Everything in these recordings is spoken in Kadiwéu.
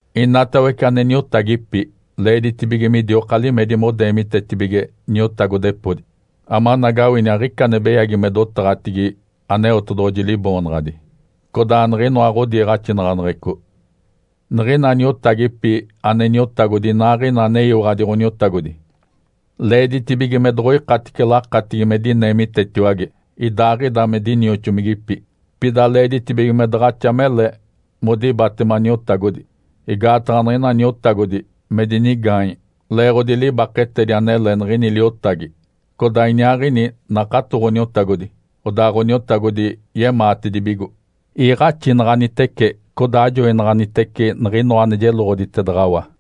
Inatawece ane niotagipi, leeditibige midioka limedi modeemitetibige niotagodepodi, amanagawini aɡ̶ica ane beyagi me dotaɡ̶atigi Aneotedoɡ̶oji Liboonaɡ̶adi, codaa niɡ̶inoa ɡ̶odiiɡ̶axinaɡ̶aneɡ̶eco. Niɡ̶ina niotagipi ane niotagodi inaaɡ̶ina aneyiwaɡ̶adi Ǥoniotagodi leeditibige me doɡ̶oikatice lakatigi me dineemitetiwage idaaɡ̶ida me dinioxomigipi. Pida leeditibige me daɡ̶axa mele modibatema niotagodi, igaataɡ̶a niɡ̶ina niotagodi me dinigaanye leeɡ̶odi libaketedi anele niɡ̶ini liotagi, codaa iniaaɡ̶ini nakato Ǥoniotagodi, odaa Ǥoniotagodi yemaatedibigo. Iiɡ̶axinaɡ̶anitece codaa ajoinaɡ̶anitece niɡ̶inoa ane jeloɡ̶oditedaɡ̶awa.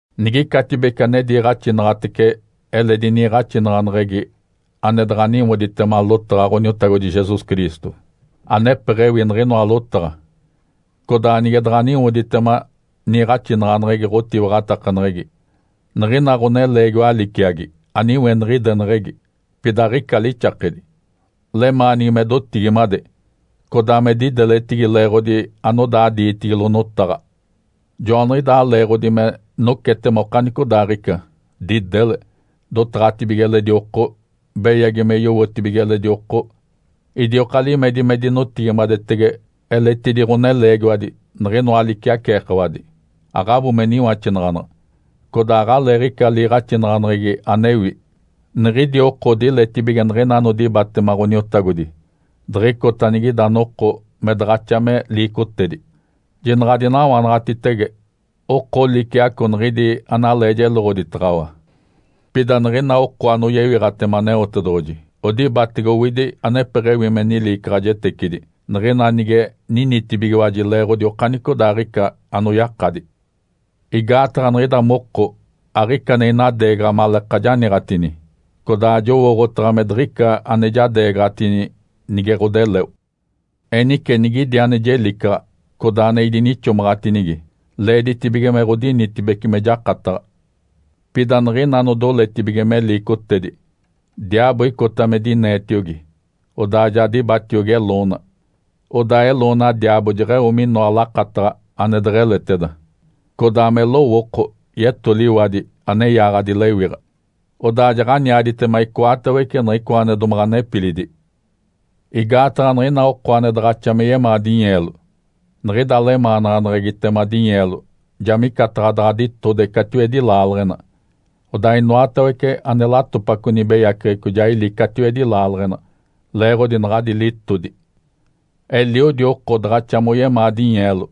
Nigicatibece ane diiɡ̶axinaɡ̶atece eledi niiɡ̶axinaɡ̶aneɡ̶egi, ane daɡ̶a niwoditema lotaɡ̶a Ǥoniotagodi Jesus Cristo, anepeɡ̶ewi niɡ̶inoa lotaɡ̶a, codaa nige daɡ̶a niwoditema niiɡ̶axinaɡ̶aneɡ̶egi ɡ̶otiwaɡ̶atakaneɡ̶egi, niɡ̶ina ɡ̶oneleegiwa liciagi aniweniɡ̶ideneɡ̶egi, pida aɡ̶ica lixakedi. Lemaanigi me dotigimade, codaa me dideletigi leeɡ̶odi anodaa diitigilo notaɡ̶a. Joaniɡ̶idaa leeɡ̶odi me nocetema okanicodaaɡ̶ica, didele, dotaɡ̶atibige eledi oko, beyagi me yowotibige eledi oko, idioka limedi me dinotigimadetege eletidi ɡ̶oneleegiwadi, niɡ̶inoa liciaceekawadi, aɡ̶abo me niwaxinaɡ̶anaɡ̶a, codaa aɡ̶aleeɡ̶ica liiɡ̶axinaɡ̶aneɡ̶egi anewi. Niɡ̶idi oko odiletibige niɡ̶ina anodibatema Ǥoniotagodi diɡ̶icota anigida noko me daɡ̶axa me liicotedi. Jinaɡ̶a adinawanaɡ̶atitege oko liciaco niɡ̶idi analee jeloɡ̶oditaɡ̶awa. Pida niɡ̶ina oko anoyewiɡ̶atema Aneotedoɡ̶oji odibatege owidi anepeɡ̶ewi me niliicaɡ̶ajetecidi, niɡ̶ina nige ninitibigiwaji leeɡ̶odi okanicodaaɡ̶ica anoyakadi. Igaataɡ̶a niɡ̶ida moko aɡ̶ica ane inadeegaɡ̶a maleeka janiiɡ̶atini, codaa jowooɡ̶otaɡ̶a me diɡ̶ica ane jadeegaɡ̶atini nige ɡ̶odeleo. Enice nigidi ane jelicaɡ̶a, codaa ane idinixomaɡ̶atinigi, leeditibige me ɡ̶odinitibece me jakataɡ̶a. Pida niɡ̶ina anodoletibige me liicotedi, diaabo icota me dineetiogi, odaa ja dibatiogi eloona. Odaa eloona diaabo jeɡ̶eo minoa lakataɡ̶a ane deɡ̶eleteda, codaa me lowooko yetoliwadi ane yaaɡ̶adi lewiɡ̶a, odaa jaɡ̶aniaditema icoatawece niɡ̶icoa ane domaɡ̶a nepilidi. Igaataɡ̶a niɡ̶ina oko ane daɡ̶axa me yemaa dinyeelo, niɡ̶ida lemaanaɡ̶aneɡ̶egitema dinyeelo ja micataɡ̶a daɡ̶a ditode catiwedi laaleɡ̶ena. Odaa inoatawece ane latopaco nibeyaceɡ̶eco ja ili catiwedi laaleɡ̶ena leeɡ̶odi naɡ̶adi litodi. Eliodi oko daɡ̶axa moyemaa dinyeelo,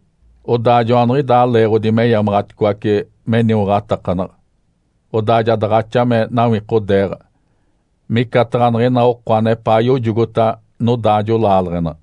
odaa joaniɡ̶idaa leeɡ̶odi meyamaɡ̶aticoace meniwaɡ̶atakanaɡ̶a, odaa ja daɡ̶axa me nawikodeeɡ̶a micataɡ̶a niɡ̶ina oko anepaa yojogota nodaajo laaleɡ̶ena.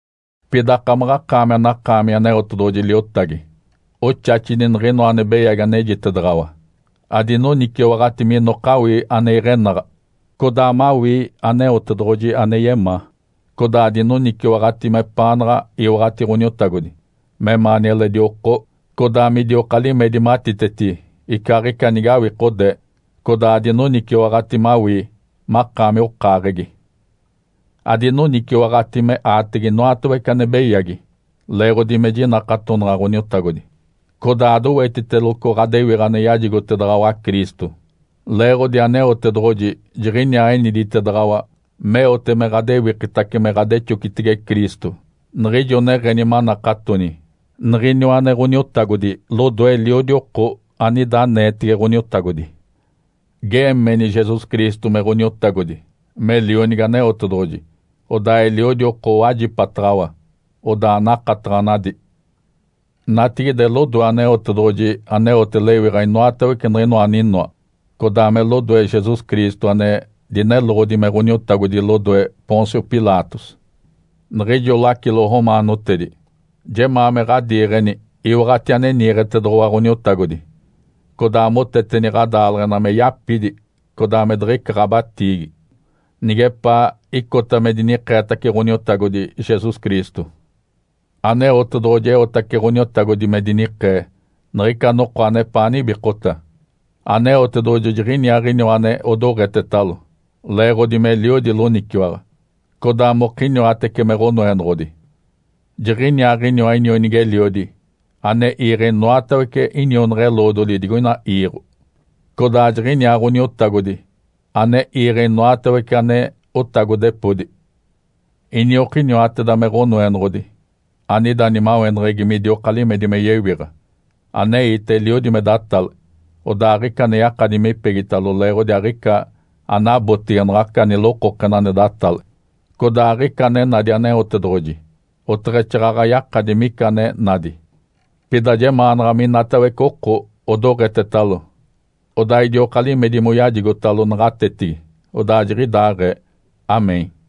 Pida akamaɡ̶akaami anakaami Aneotedoɡ̶oji liotagi, oxaxini niɡ̶inoa ane beyagi anejitedaɡ̶awa. Adinoniciwaɡ̶ati minoka awii ane iɡ̶enaɡ̶a, codaa mawii Aneotedoɡ̶oji ane yemaa, codaa adinoniciwaɡ̶ati mepaanaɡ̶a iwaɡ̶ati Ǥoniotagodi, memaani eledi oko, codaa midioka limedi matiteti icaaɡ̶ica nige awikodee, codaa adinoniciwaɡ̶ati mawii makaami okaaɡ̶egi. Adinoniciwaɡ̶ati me aatege inoatawece ane beyagi, leeɡ̶odi me jinakatonaɡ̶a Ǥoniotagodi, codaa adowetiteloco ɡ̶adewiɡ̶a ane yajigotedaɡ̶awa Cristo. Leeɡ̶odi Aneotedoɡ̶oji jiɡ̶iniaa eniditedaɡ̶awa meote me ɡ̶adewikitace me ɡ̶adexocitege Cristo niɡ̶ijo neɡ̶eni manakatoni niɡ̶iniwa ane Ǥoniotagodi lodoe eliodi oko anida aneetege Ǥoniotagodi. Geemeni Jesus Cristo me Ǥoniotagodi, me Lionigi Aneotedoɡ̶oji, odaa eliodi oko owajipataɡ̶awa, odaa nakataɡ̶anadi. Natigide, lodoe Aneotedoɡ̶oji aneote lewiɡ̶a inoatawece niɡ̶inoa aninoa, codaa me lodoe Jesus Cristo ane dineloɡ̶odi me Ǥoniotagodi lodoe Pôncio Pilatos, niɡ̶ijo lacilo romaanotedi, jemaa me ɡ̶adiiɡ̶eni iwaɡ̶ati ane niiɡ̶etedoɡ̶owa Ǥoniotagodi, codaa moteteni ɡ̶adaaleɡ̶ena me yapidi codaa me diɡ̶ica ɡ̶abatiigi, nigepaa icota me dinikeetace Ǥoniotagodi Jesus Cristo. Aneotedoɡ̶oji eotace Ǥoniotagodi me dinikee niɡ̶ica noko anepaa nibikota. Aneotedoɡ̶oji jiɡ̶iniaaɡ̶iniwa ane odoɡ̶etetalo, leeɡ̶odi meliodi loniciwaɡ̶a, codaa mokiniwatece me Ǥonoenoɡ̶odi. Jiɡ̶iniaaɡ̶iniwa inionigi-eliodi ane iiɡ̶e inoatawece inionaɡ̶a-eloodoli digoina iiɡ̶o, codaa jiɡ̶iniaa Ǥoniotagodi ane iiɡ̶e inoatawece ane otagodepodi. Iniokiniwateda me Ǥonoenoɡ̶odi anida nimaweneɡ̶egi midioka limedi me yewiɡ̶a. Aneite eliodi me datale, odaa aɡ̶ica ane yakadi mipegitalo leeɡ̶odi aɡ̶ica anabotege naɡ̶aca nilokokena ane datale. Codaa aɡ̶ica ane nadi Aneotedoɡ̶oji, oteɡ̶exaaɡ̶aɡ̶a yakadi mica ane nadi. Pida jemaanaɡ̶a minatawece oko odoɡ̶etetalo, odaa idioka limedi moyajigotalo naɡ̶atetigi. Odaa jiɡ̶idaaɡ̶ee (Amém).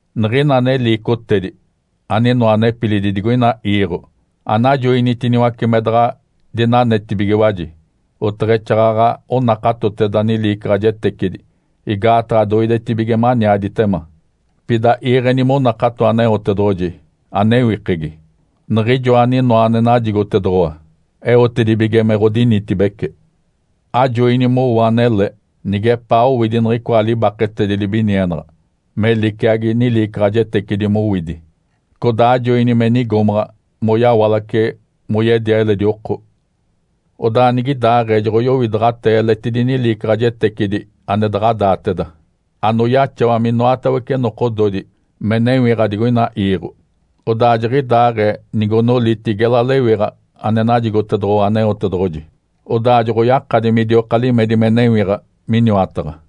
Niɡ̶ina ane liicotedi, aninoa nepilidi digoina iiɡ̶o, anajoinitiniwace me daɡ̶a dinanetibigiwaji, oteɡ̶exaaɡ̶aɡ̶a onakatoteda niliicaɡ̶ajetecidi igaataɡ̶a doidetibige maniaditema. Pida iiɡ̶eni monakato Aneotedoɡ̶oji anewikegi, Niɡ̶ijoa aninoa ane najigotedoɡ̶owa eotedibige me ɡ̶odinitibece. Ajoini mowo anele, nigepaa owidi niɡ̶icoa libaketedi libinienaɡ̶a, me liciagi niliicaɡ̶ajetecidi mowidi. Codaa ajoini me nigomaɡ̶a moyawalace moyedia eledi oko. Odaa nigidaaɡ̶ee joɡ̶oyowidaɡ̶atee eletidi niliicaɡ̶ajetecidi ane daɡ̶a daateda, anoyaxawa minoatawece nokododi me newiɡ̶a digoina iiɡ̶o. Odaa jiɡ̶idaaɡ̶ee nigonoliti gela lewiɡ̶a ane najigotedoɡ̶owa Aneotedoɡ̶oji, odaa joɡ̶oyakadi midioka limedi me newiɡ̶a miniwataɡ̶a.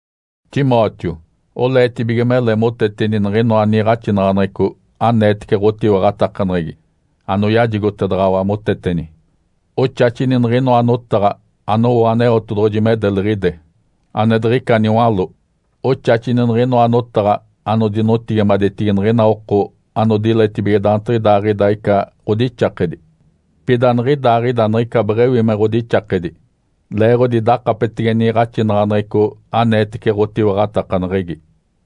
Timóteo. Oleetibige mele moteteni niɡ̶inoa niiɡ̶axinaɡ̶aneɡ̶eco aneetece ɡ̶otiwaɡ̶atakaneɡ̶egi anoyajigotedaɡ̶awa moteteni. Oxaxini niɡ̶inoa notaɡ̶a anowo Aneotedoɡ̶oji me deliɡ̶ide, ane diɡ̶ica niwaló. Oxaxini niɡ̶inoa notaɡ̶a anodinotigimadetigi niɡ̶ina oko anodiletibige daantiɡ̶idaaɡ̶ida ica ɡ̶odixakedi, pida aniɡ̶idaaɡ̶ida niɡ̶ica beɡ̶ewi me ɡ̶odixakedi, leeɡ̶odi dakapetege niiɡ̶axinaɡ̶aneɡ̶eco aneetece ɡ̶otiwaɡ̶atakaneɡ̶egi.